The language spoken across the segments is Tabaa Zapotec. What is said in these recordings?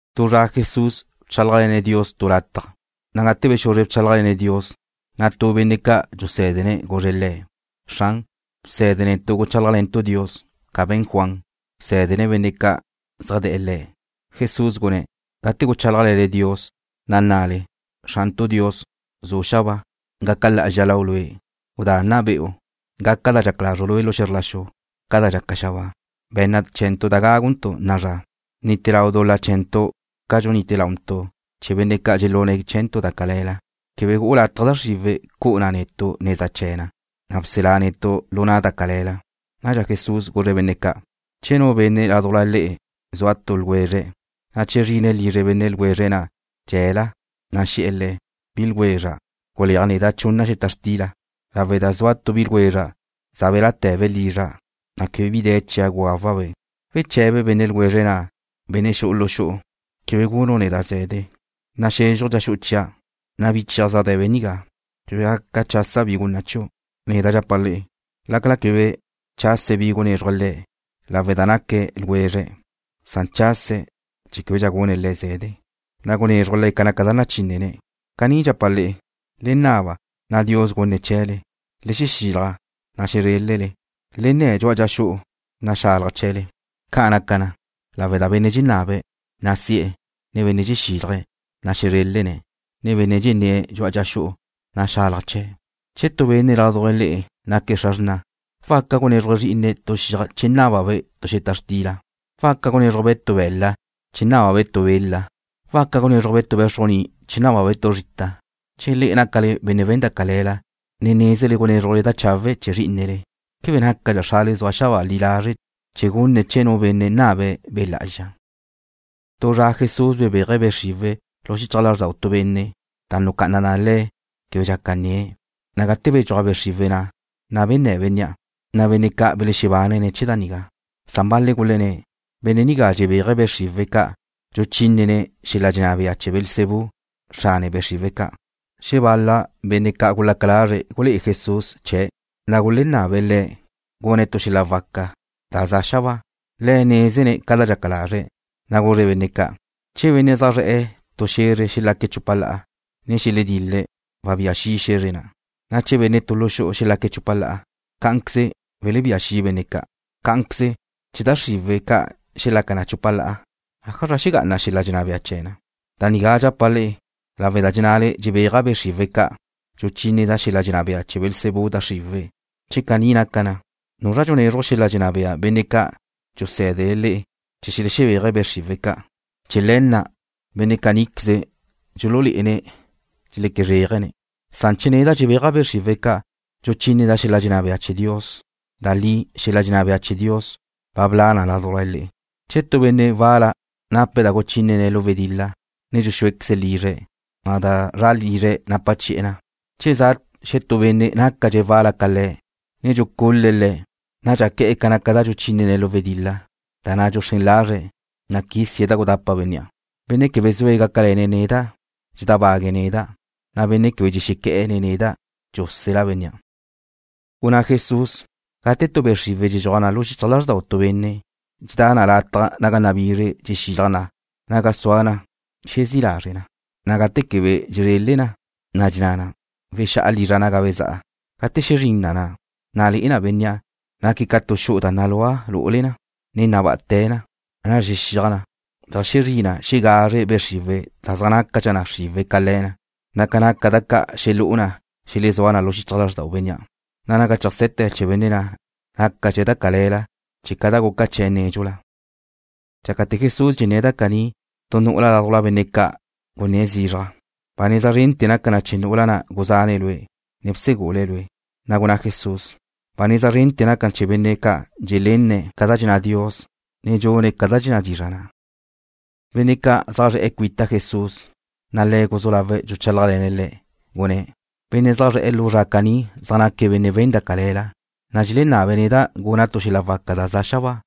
Tu zra Jesús bchálajle̱ne̱' Dios tu lataj, na' gate bexuzre bchálajle̱ne̱' Dios, na' tu benne' ca' dxusé̱dene̱' guzre̱' Le̱': ―Xran, bse̱de netu' guchálajle̱ntu' Dios, ca be̱n Juan, bsé̱dene̱' benne' ca' zaj de̱'e̱ le̱'. Jesús gunné̱': ―Gate guchálajle̱le Dios, na' nnale: Xrantu' Dios, zu' xabáa, gaca lá'azxa Lau' Lue'. Gudá nna be'u. Gaca ca dxaca lazru' lu xe̱zr la xu, ca da dxaca xabáa. Be̱nna chee̱ntu' da gáguntu' na'a zra. Bnite lau dul-la chee̱ntu' ca dxunite launtu' chee̱ benne' ca' dxelune̱' chee̱ntu' da cale̱la. Quebe gu'u lataj da xriwe̱' cu'u na netu' neza chee̱ na, na' bselá netu' lu na' da cale̱la. Nadxa Jesús guzre̱' benne' ca': ―Che tu benne' ládujla le'e zua tu ljwezre̱', na' che zrine̱' lizre benne' ljwezre̱' na' dxe̱la, ne xe̱'e̱ le̱': “Bi ljwezra', guleaj neda' chunna xeta xtila lawe' da zua tu bi ljwezra' za belá'te̱be' lizra', na' quebe bi de̱ chia' gugawa'-be'.” ¿Weche̱be benne' ljwezre̱' na', benne' xu'u lu xu'u: “Quebe gunu' neda' ze̱de. Naxezxuj dxa xu'u chia', na' bi chia' zaj de̱be' nigá. Quebe gaca chasa' bi gunna' chiu'?” Neda' dxapa' le'e, lácala quebe chase̱' bi gunézruje̱' le̱' lawe' da naque̱' ljwezre̱', san chase̱' chee̱ québedxa gune̱' le̱' ze̱de, na' gunézruje̱' le̱' ca naca da nachínnene̱'. Caní dxapa' le'e: Le naba, na' Dios gunne̱' chee̱le. Le xexilaj, na' xezrélele. Le nne̱ dxu'a dxa xu'u, na' xalaj chee̱le. Ca' naca na, lawe' da benne' dxenabe̱', na' si'e̱, ne benne' dxexílaje̱', na' xezrélene̱', ne benne' dxenné̱' dxu'a dxa xu'u, na' xalaj chee̱'. ’Che tu benne' ládujla le'e naque̱' xra xrna', ¿waca gunézruje̱' zrí'ine̱' tu xiaj che nábabe' tu xeta xtila? ¿Waca gunézruje̱'-be' tu be̱la' che nábabe' tu bela? ¿Waca gunézruje̱'-be' tu bé̱xrujni che nábabe' tu zrita? Che le'e nácale benne' we̱n da cale̱la, na' nézele gunézrujle da chawe' chee̱ zrí'inele, ¿quebe nácadxa Xrale zua xabáa li lazre' chee̱ gunne̱' chee̱ nu benne' nabe̱' Be' Lá'azxa? Tu zra Jesús bebéaje̱' be' xriwe̱' lu xichaj lázrdau tu benne', da nucá'ana na le̱' quebe dxaca nnie̱', na' gate bedxúaj be' xriwe̱' na', na' benné' bénnea'. Na' benne' ca' belexebánene̱' chee̱ da nigá. Na' bal-le̱' gulenné̱': ―Benne' nigá dxebéaje̱' be' xriwe̱' ca', dxuchínene̱' xel-la dxenná bea chee̱ Beelzebú, xrane be' xriwe̱' ca'. Xebal-la benne' gulaca lazre̱' gulé'e Jesús xel-la waca chee̱', na' gulenabe̱' Le̱' gune̱' tu xel-la waca da za xabáa. Le̱' nézene̱' ca da dxelaca lazre̱', na' guzre̱' benne' ca': ―Che benne' zaj zre̱'e̱ tu xe̱zre xelaque̱' chupa la'a, ne xeledil-le̱', wabía xi' xe̱zre na', na' che benne' tu lu xu'u xelaque̱' chupa la'a, cá'anqueze welebía xi' benne' ca'. Cá'anqueze, che da xriwe̱' ca' xelaca na chupa la'a, ¿ájazra xegá'ana xel-la dxenná bea chee̱ na? Da nigá dxapa' le'e lawe' da dxenné̱le dxebéaja' be' xriwe̱' ca', dxuchíneda' xel-la dxenná bea chee̱ Beelzebú da xriwe̱'. Che caní naca na, ¿nuzra dxunezruj xel-la dxenná bea benne' ca' dxusé̱dele le'e chee̱ xelexebéaje̱' be' xriwe̱' ca'? Chee̱ le̱ na', benne' caníqueze dxululé'ene̱' dxeque zréajele. Na'a che neda' dxebéaja' be' xriwe̱' ca', dxuchíneda' xel-la dxenná bea chee̱ Dios, da li xel-la dxenná bea chee̱ Dios ba bla' na ládujla le'e. ’Che tu benne' wal-la nape̱' da guchínene̱' lu wedil-la, ne dxuxúequeze̱' lizre̱', na' da zra lizre̱' napa chi'e̱ na. Che za' xetú benne' nácadxe̱' wal-la ca le̱', ne dxucul-le̱' le̱', nadxa que̱'e̱ ca naca da dxuchínene̱' lu wedil-la, da na' dxuxrén lazre̱', na' quisie̱' da gudapa bénnea'. ’Benne' quebe zue̱' gácale̱ne̱' neda', dxedábague̱' neda', na' benne' quebe dxexequé̱'e̱ nen neda' dxúsela bénnea'. Gunná Jesús: ―Gate tu be' xriwe̱' dxedxuaj na lu xichaj lázrdau tu benne', dxedá na lataj naga nabizre dxexilaj na naga sua na xezí' lazre' na, na' gate quebe dxezrele na, na' dxenná na: “Wexá'a lizra' naga bezá'a.” Gate xezrín na, na' le'e na bénnea' naque̱' ca tu xu'u da nalúa lu'ule na, ne nabá'ate̱ na. Nadxa zexíaj na, zeajxezrí na xegazre be' xriwe̱' da zaj nácadxa na xriwe' ca le̱ na, na' ca naca da ca' xelú'u na xelezúa na lu xichaj lázrdau bénnea', na' naga cheajse̱te̱ chee̱ benne' na' nácadxa da cale̱la chee̱' ca da guca chee̱' nédxula. Dxácate̱ Jesús dxenné̱' da caní, tu nu'ula ládujla benne' ca' gunné̱' zizraj: ―Ba neza zrente̱ naca na chee̱ nu'ula na' guzane̱' Lue', ne bsegule̱' Lue'. Na' gunná Jesús: ―Ba neza zrendxa naca na chee̱ benne' ca' dxelenne̱' ca da dxenná Dios, ne dxune̱' ca dxenná dizra' na'. Benne' ca' ne zaj zre̱'e̱ cuita Jesús, na' Le̱' guzú lawe̱' dxuchálajle̱ne̱' le̱', gunné̱': ―Benne' zaj zre̱'e̱ lu zra caní zaj naque̱' benne' we̱n da cale̱la, na' dxelenabe̱' neda' guna' tu xel-la waca da za xabáa,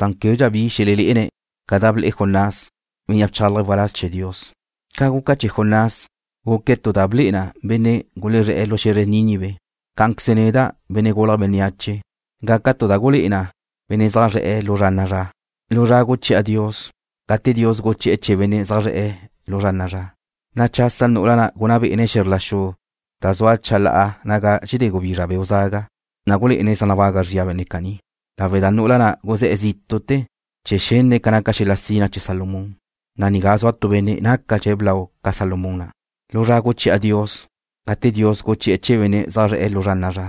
na' québedxa bi xelelé'ene̱' ca da ble'e Jonás, bénnea' bchálaje̱' waláz chee̱ Dios. Ca guca chee̱ Jonás, guque̱' tu da ble'e na benne' gulezré̱'e̱ lu xe̱zre Nínive, cá'anqueze neda', Benne' Gulje̱' Bénneache, gaca' tu da gulé'e na benne' zaj zre̱'e̱ lu zra na'a zra. Lu zra guchi'a Dios, gate Dios guchi'e̱ chee̱ benne' zaj zre̱'e̱ lu zra na'a zra, na' chasa nu'ula na' gunná bé'ene̱' xe̱zr la xu da zua chalá'a naga dxedé gubizra beu' zaga ca', na' gulé'ene̱' zaj nabaga zria benne' caní, lawe' da nu'ula na' guzé̱'e̱ zítu'te̱ chee̱ xenne̱' ca naca xel-la sina chee̱ Salomón, na' nigá zua tu Benne' nácadxe̱' blau ca Salomón na'. Lu zra guchi'a Dios, gate Dios guchi'e̱ chee̱ benne' zaj zre̱'e̱ lu zra na'a zra,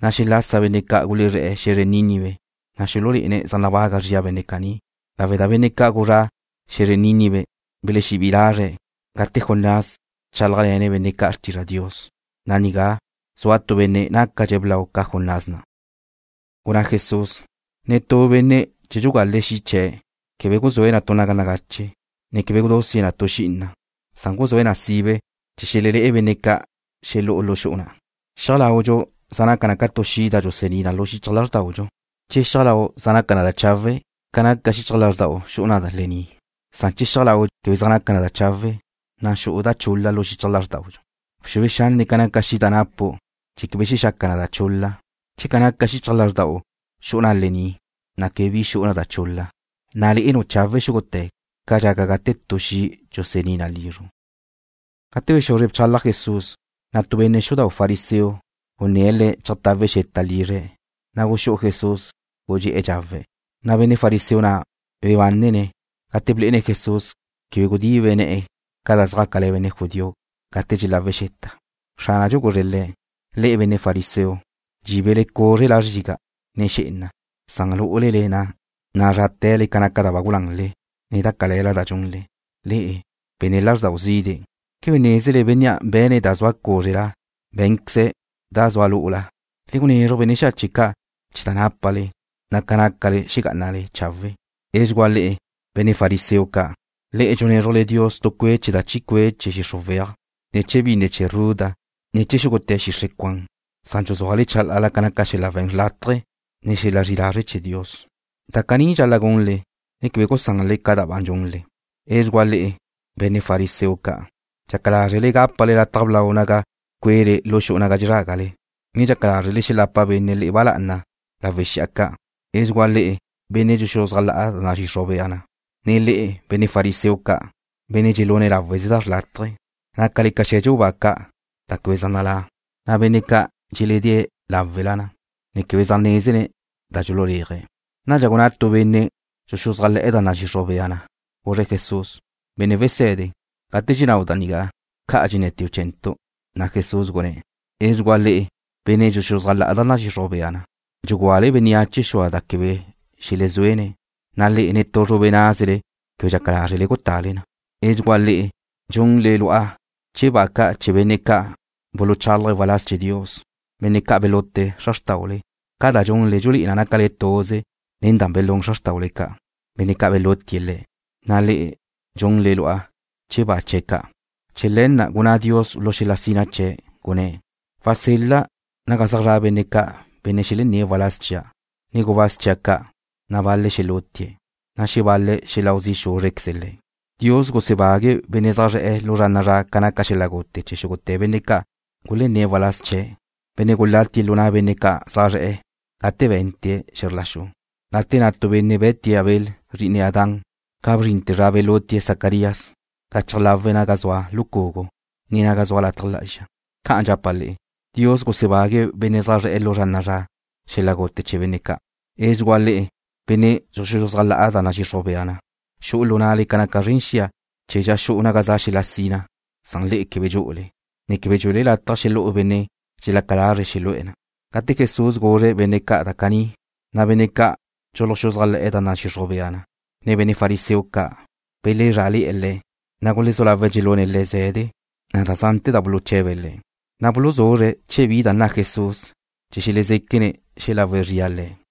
na' xelase̱' benne' ca' gulezré̱'e̱ xe̱zre Nínive, na' xululé'ene̱' zaj nabaga zria benne' caní, lawe' da benne' ca' gulezré̱'e̱ xe̱zre Nínive belexebí'i lazre̱' gate Jonás bchálajle̱ne̱' benne' ca' xrtizra' Dios, na' nigá zua tu Benne' nácadxe̱' blau ca Jonás na'. Gunná Jesús: ―Netú benne' che dxugale̱' xi' chee̱', quebe guzúe̱' na tu naga nagache, ne quebe gudusie̱' na tu xi'ina, san guzúe̱' na sibe chee̱ xelelé'e benne' ca' xelu'e̱ lu xu'u na'. Xiaj laudxu zaj naca na ca tu xi' da dxusení na lu xichaj lázrdaudxu. Che xiaj lau' zaj naca na chawe', ca naca xichaj lázrda'u xu'u na lení', na' che xiaj lau' quebe zaj naca na chawe', na' xu'u da chul-la lu xichaj lázrda'u. Bxue xanne' ca naca xi' da napu' chee̱ quebe xexaca na da chul-la. Che ca naca xichaj lázrda'u xu'u na lení', na' quebe bi xu'u da chul-la, na' le'enu' chawe' xúgute̱ ca dxaca gate tu xi' dxusení na lizru'. Gate bexuzre bchalaj Jesús, na' tu benne' xudau' fariseo gunné̱' Le̱' cheajtawe̱' xeta lizre̱'. Na' guxú'u Jesús, gudxé'e̱ dxawe̱'. Na' benne' fariseo na' bebánene̱' gate blé'ene̱' Jesús quebe gudibe ne̱'e̱ ca da zjácale̱ benne' judío gate dxelawe̱' xeta. Xránadxu guzre̱' le̱': ―Le'e, benne' fariseo, dxíbele cúzrela zriga', ne xé'ena, san lu'ule na, nazráte̱le ca naca da ba gulanle, ne da cale̱la da dxunle. Le'e, benne' lázrdau zide', ¿quebe nézele Bénnea' be̱ne̱' da zua cúzrela bé̱nqueze̱' da zua lu'ula? Le gunezruj benne' xache' ca' chee̱ da nápale, na' ca nácale xegá'anale chawe'. ’¡Edxugúa le'e, benne' fariseo ca'! Le'e dxunézrujle Dios tu cue' chee̱ da chi cue' chee̱ xixru weaj, ne chee̱ binne chee̱ ruda, ne chee̱ xúgute̱ xixre' cuan, san dxuzúale chalá'ala ca naca xel-la we̱n xrlátaje, ne xel-la zri'i lazre' chee̱ Dios. Da caní dxal-la' gunle, ne quebe gusanle ca da ba dxunle. ’¡Edxugúa le'e, benne' fariseo ca'! Dxaca lázrele gápale lataj blau naga cue'le lu xu'u naga dxezrágale, ne dxaca lázrele xelapa benne' le'e ba lá'ana lawe' xi'a ca'. ’¡Edxugúa le'e, benne' dxuluxuzájla'a da nadxixruj bea na, ne le'e, benne' fariseo ca', benne' dxelúne̱' láweze da xrlátaje! Nácale ca xe̱dxu ba ca' da quebe zaj nalá', na' benne' ca' dxeledée̱' láwela na, ne quebe zaj nézene̱' da dxululéaje̱'. Nadxa gunná tu benne' dxuxuzájle̱'e̱ da nadxixruj bea na, guzre̱' Jesús: ―Benne' Wese̱de, gate dxennáu' da nigá, dxenné̱teu' ca' chee̱ntu'. Na' Jesús gunné̱': ―¡Edxugúa le'e, benne' dxuluxuzájle̱'e̱ da nadxixruj bea na! Dxugúale bénneache xua da quebe xelezuéne̱', na' le'e netú zrube názele quebe dxaca lázrele gutale na. ’¡Edxugúa le'e! Dxunle lu'a chee̱ ba ca' chee̱ benne' ca' buluchálaje̱' waláz chee̱ Dios, benne' ca' belute xra xrtáule. Ca da dxunle dxulé'e na nácale tuze nen da belún xra xrtáule ca'. Benne' ca' belutie̱' le̱', na' le'e dxunle lu'a chee̱ ba chee̱' ca'. ’Chee̱ le̱ na' gunná Dios lu xel-la sina chee̱', gunné̱': “Wasel-la' naga zaj zra' benne' ca' benne' xelenné̱' waláz chia', ne gubáz chia' ca', na' bal-le̱' xelútie̱', na' xebal-le̱' xeláu zi' xúzrequeze̱' le̱'.” Dios gusebague̱' benne' zaj zre̱'e̱ lu zra na'a zra ca naca xel-la gute chee̱ xúgute̱ benne' ca' gulenné̱' waláz chee̱', benne' gulatie̱' lu na' benne' ca' zaj zre̱'e̱ gate bente̱' xe̱zr la xu, gate na' tu benne' be̱tie̱' Abel, zri'ine Adán, ca bzrinte̱ zra belutie̱' Zacarías gachaj láwela naga zua lucugu, ne naga zua lataj lá'azxa. Ca'an dxapa' le'e, Dios gusebague̱' benne' zaj zre̱'e̱ lu zra na'a zra xel-la gute chee̱ benne' ca'. ’¡Edxugúa le'e, benne' dxuluxuzájla'a da nadxixruj bea na! Xu'u lu na'le ca naca zren xia chee̱ dxa xu'u naga za xel-la sina, san le'e quebe dxu'ule, ne quebe dxuele lataj xelú'u benne' dxelaca lazre̱' xelu'e̱ na'. Gate Jesús guzre̱' benne' ca' da caní, na' benne' ca' dxuluxuzájle̱'e̱ da nadxixruj bea na, ne benne' fariseo ca' belezrá'ale̱'e̱ Le̱', na' gulezú lawe̱' dxelune̱' Le̱' ze̱de, na' da zante̱ da buluche̱be̱' Le̱', na' buluzuzre̱' che bi nna Jesús chee̱ xelezéquene̱' xelagu zrie̱' Le̱'.